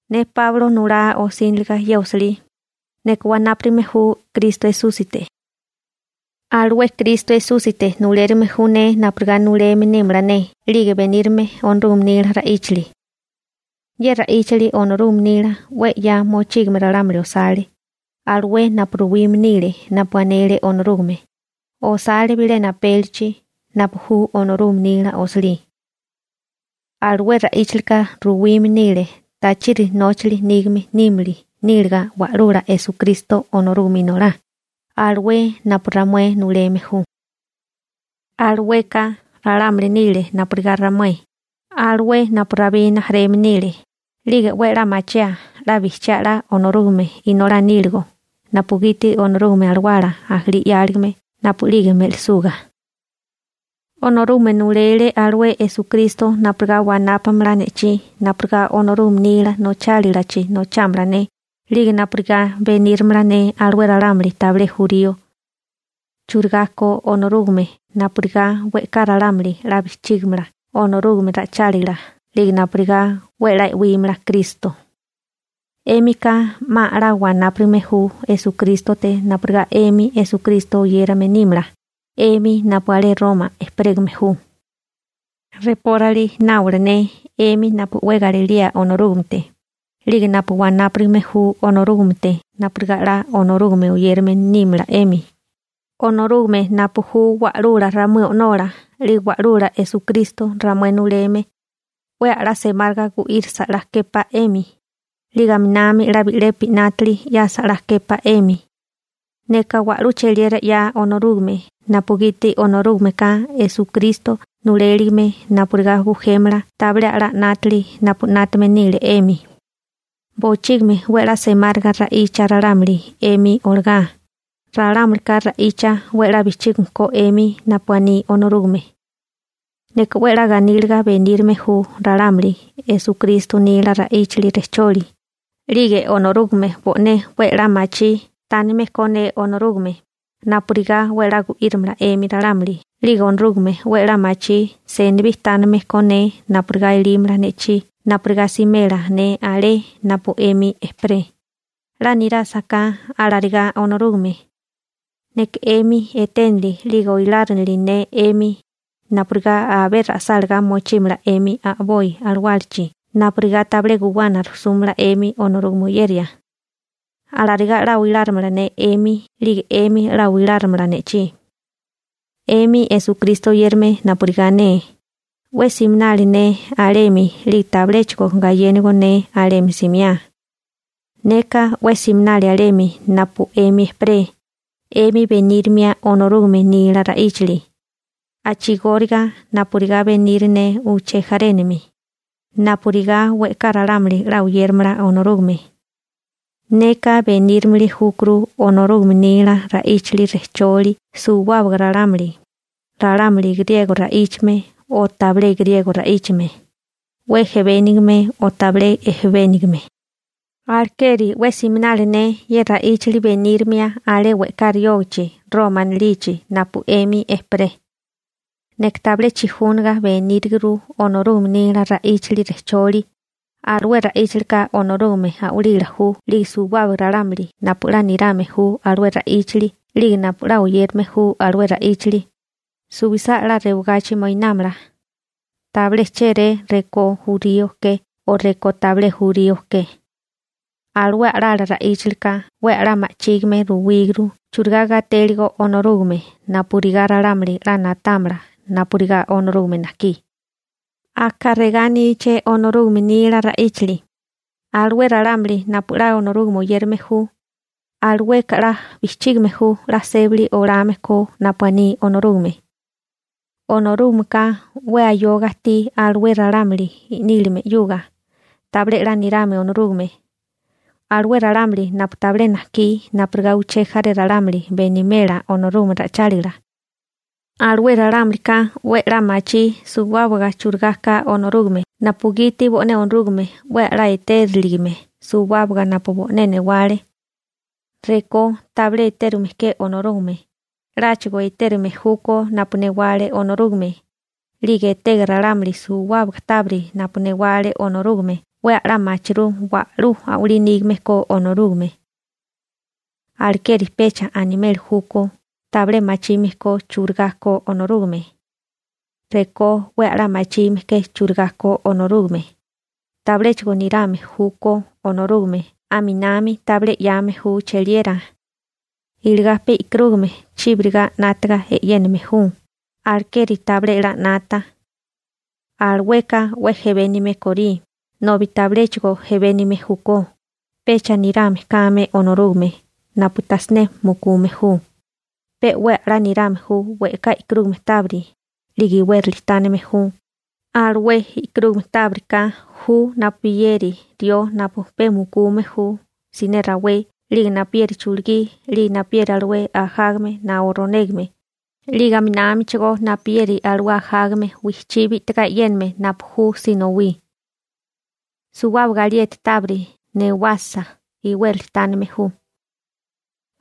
Ne Páulo nulá osíniliga ye osilí, neka wanápurigame ju Kristo Esúsite. Alué Kristo Esúsite nulérigime ju ne napurigá nuleme nímala ne 'lige benírame Onorúgame nila ra'íchali. Ye ra'íchali Onorúgame nila 'we 'ya mochígame ralámuli osale, alué napu ruwime nile napu anele Onorúgame, osale bilena apélichi, napu ju Onorúgame nila osilí. Alué ra'íchalika ruwime nile tachiri nóchali nígame nímili níliga Wa'lula Esukristo Onorúgame Inolá, alué napu ramué nuleme ju. Alueka ralámuli nile napurigá ramué, alué napu Rabí rijimala nile. 'Lige 'we 'la machiaa 'la bijchiá 'la Onorúgame Inolá níligo napugiti Onorúgame Alawala ajalí 'yáligame napu'lige me'lisuga. Onorúgame nulele alué Esukristo napurigá wanápamala ne'chí napurigá Onorúgame nila nochálilachi nochámala ne, 'lige napurigá beníramala ne alué ralámuli tabilé jurío churigá ko Onorúgame napurigá we'ká ralámuli 'la bijchígimala Onorúgame ra'ichálila 'lige napurigá 'we 'la e'wímala Kristo. 'Émika 'ma a'lá wanápurigame ju Esukrístote napurigá 'emi Esukristo oyérame nímala, 'emi napu alé Roma ejperégame ju. Reporali náwala ne, 'emi napu 'we galilía Onorúgamete, 'lige napu wanápurigame ju Onorúgamete napurigá 'la Onorúgame oyérame nímala 'emi, Onorúgame napu ju Wa'lula ramué O'nola 'lige Wa'lula Esukristo ramué nuleme 'we a'lá semáriga gu'írisa 'la képá 'emi, 'lige aminami 'la bi'lepi 'nátili 'yasa 'la képá 'emi. Neka wa'lú cheliera 'ya Onorúgame napugiti Onorúgameka Esukristo nuléligime napurigá bujémala tabilé a'lá 'nátili napu 'nátame nile 'emi. Bochígimi 'we a'lá semáriga ra'icha ralámuli 'emi olagá, ralámulika ra'icha 'we 'la bijchígame ko 'emi napu aní Onorúgame. Neka 'we 'la ganíliga benírime ju ralámuli Esukristo nila ra'íchali rejcholi, 'lige Onorúgame bo'né 'we a'lá machí tánime ko ne Onorúgame, napurigá 'we a'lá gu'írimala 'emi ralámuli 'lige Onorúgame 'we a'lá machí senibí tánime ko ne napurigá elímala ne'chí napurigá simela ne alé napu 'emi ejperé, 'la nirásaká alarigá Onorúgame. Neka 'emi eténili 'lige oilárinili ne 'emi napurigá abé ra'sálagá mochímala 'emi a'boi alawálachi napurigá tabilé guwana rujsúmala 'emi Onorúgame oyeria. Alarigá 'la oilárimala ne 'emi 'lige 'emi 'la oilárimala ne'chí. 'Emi Esukristo oyérame napurigá ne, 'we siminali ne alemi 'lige tabiléchigo gayénigo ne alemi simiá. Neka 'we siminali alemi napu 'emi ejperé 'emi benírimia Onorúgame nila ra'íchali, a'chigóriga napurigá beniri ne uché jarénami, napurigá we'ká ralámuli 'la oyéramala Onorúgame. Neka benírimili júkuru Onorúgame nila ra'íchali rejcholi suwábaga ralámuli, ralámuli griego ra'íchame o tabilé griego ra'íchame, 'we jebénigame o tabilé jebénigame. Alekeri 'we siminali ne ye ra'íchali benírimia alé we'ká riógachi Roma anilichi napu 'emi ejperé. Neka tabilé chijúniga beníriguru Onorúgame nila ra'íchali rejcholi, alué ra'íchalika Onorúgame a'walila ju 'lige suwábaga ralámuli napu 'la nirame ju alué ra'íchali 'lige napu 'la oyérame ju alué ra'íchali, suwisá 'la rewagachi moinámala. Tabilé chéré rekó jurío ke o rekó tabilé jurío ke. Alué a'lala ra'íchalika 'we a'lá ma'chígime ruwíguru churigá gatéligo Onorúgame napurigá ralámuli 'la na'támala napurigá Onorúgame najkí. Aka regá aníché Onorúgame nila ra'íchali: «Alué ralámuli napu 'la Onorúgame oyérame ju, alueka 'la bijchígame ju 'la sébali olame ko napu aní Onorúgame.» Onorúgameka 'we ayoga ajtí alué ralámuli i'nílime 'yuga tabilé 'la nirame Onorúgame, alué ralámuli napu tabilé najkí napurigá uché jaré ralámuli benimela Onorúgame ra'ichálila. Alué ralámulika 'we a'lá machí suwábaga churigá ka Onorúgame napugiti bo'né Onorúgame 'we a'lá etériligime suwábaga napu bo'né newale. Rekó tabilé etérume ke Onorúgame, 'láchigo etérume júkó napu newale Onorúgame, 'lige etega ralámuli suwábaga tábiri napu newale Onorúgame 'we a'lá machirú wa'lú a'walí nígame ko Onorúgame. Alekeri pecha animeli júkó tabilé machime ko churigá ko Onorúgame. Rekó 'we a'lá machime ke churigá ko Onorúgame, tabiléchigo nirame júkó Onorúgame aminami tabilé 'yame ju cheliera. Iligá pe e'karúgame chíbiriga 'nátaga e'yéname ju, alekeri tabilé 'la 'nata. Alueka 'we jebénime korí, nobi tabiléchigo jebénime júkó, pecha nirame kame Onorúgame napu tajsiné mukume ju, pe 'we a'lá nirame ju we'ká e'karúgame tábiri, 'lige iwérali tánime ju, alué e'karúgame tábiri ka ju napuyeri rió napu pe mukume ju siné rawé 'lige napuyeri chulugí 'lige napuyeri alué ajágame naó ronégame 'lige aminámichigó napuyeri alué ajágame wijchí bi'tigá e'yéname napu ju sinowí. Suwábaga alieti tábiri newasa iwérali tánime ju.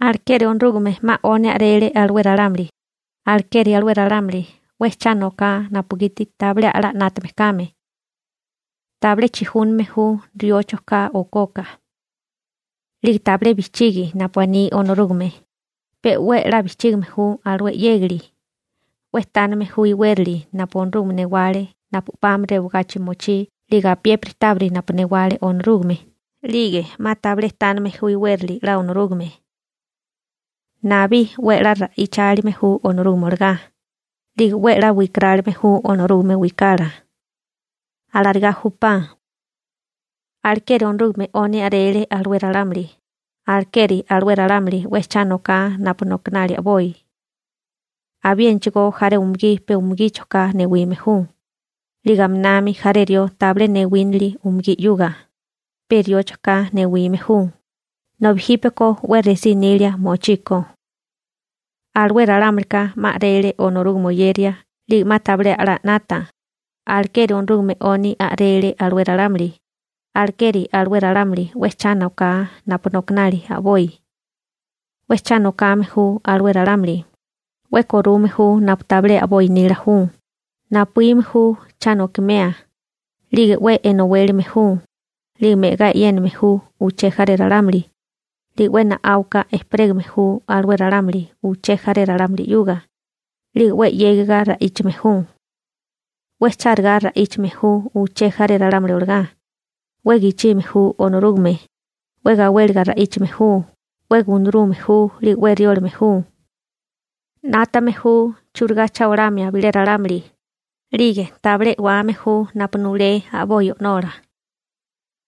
Alekeri Onorúgame 'ma 'oni a'rele alué ralámuli, alekeri alué ralámuli 'we cha noká napugiti tabilé a'lá 'nátame kame. Tabilé chijúname ju rióchoká okoka. 'Lige tabilé bijchigi napu aní Onorúgame, pe 'we 'la bijchígime ju alué 'yégali, 'we tánime ju iwérali napu Onorúgame newale napu 'pami rewagachi mochí 'lige apiépiri tábiri napu newale Onorúgame 'lige 'ma tabilé tánime ju iwérali 'la Onorúgame. Nabí 'we 'la ra'ichálime ju Onorúgame olagá, 'lige 'we 'la wikarálime ju Onorúgame wikala. Alarigá júpá. Alekeri Onorúgame 'oni a'rele alué ralámuli, alekeri alué ralámuli 'we cha noká napu nokanali a'boi. Abiénachigo jaré umugí pe umugíchoká newime ju, 'lige aminami jaré rió tabilé newínili umugí 'yuga, pe rióchoká newime ju, nobi jípeko 'we resí nilia mochiko. Alué ralámulika 'ma a'rele Onorúgame oyeria 'lige 'ma tabilé a'lá 'nata, alekeri Onorúgame 'oni a'rele alué ralámuli, alekeri alué ralámuli 'we cha noká napu nokanali a'boi. 'We cha nokame ju alué ralámuli, 'we korume ju napu tabilé a'boi nila ju, napuíme ju cha nokimea, 'lige 'we enowélame ju, 'lige me'gá e'yéname ju uché jaré ralámuli, 'lige 'we na'áuka ejperégame ju alué ralámuli uché jaré ralámuli 'yuga, 'lige 'we 'yégiga ra'íchime ju. 'We chárigá ra'íchame ju uché jaré ralámuli olagá, 'we gichime ju Onorúgame, 'we gawéliga ra'íchame ju, 'we gunarume ju 'lige 'we riólame ju. 'Nátame ju churigá cha olamia bilé ralámuli, 'lige tabilé e'wame ju napu nulé a'boi o'nola.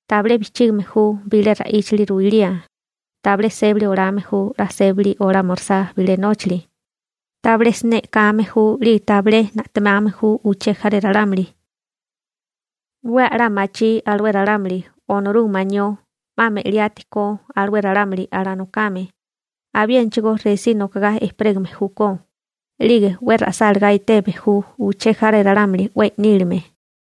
Tabilé bijchígime ju bilé ra'íchali ruilía, tabilé sébali olame ju 'la sébali olámirisá bilé nóchali, tabilé siné e'kame ju 'lige tabilé na'temame ju uché jaré ralámuli. 'We a'lá machí alué ralámuli Onorúgame anió 'ma me'liati ko alué ralámuli alanokame, abiénachigo resí nokagá ejperégame júkó, 'lige 'we ra'sálagá eteme ju uché jaré ralámuli 'we i'nílime.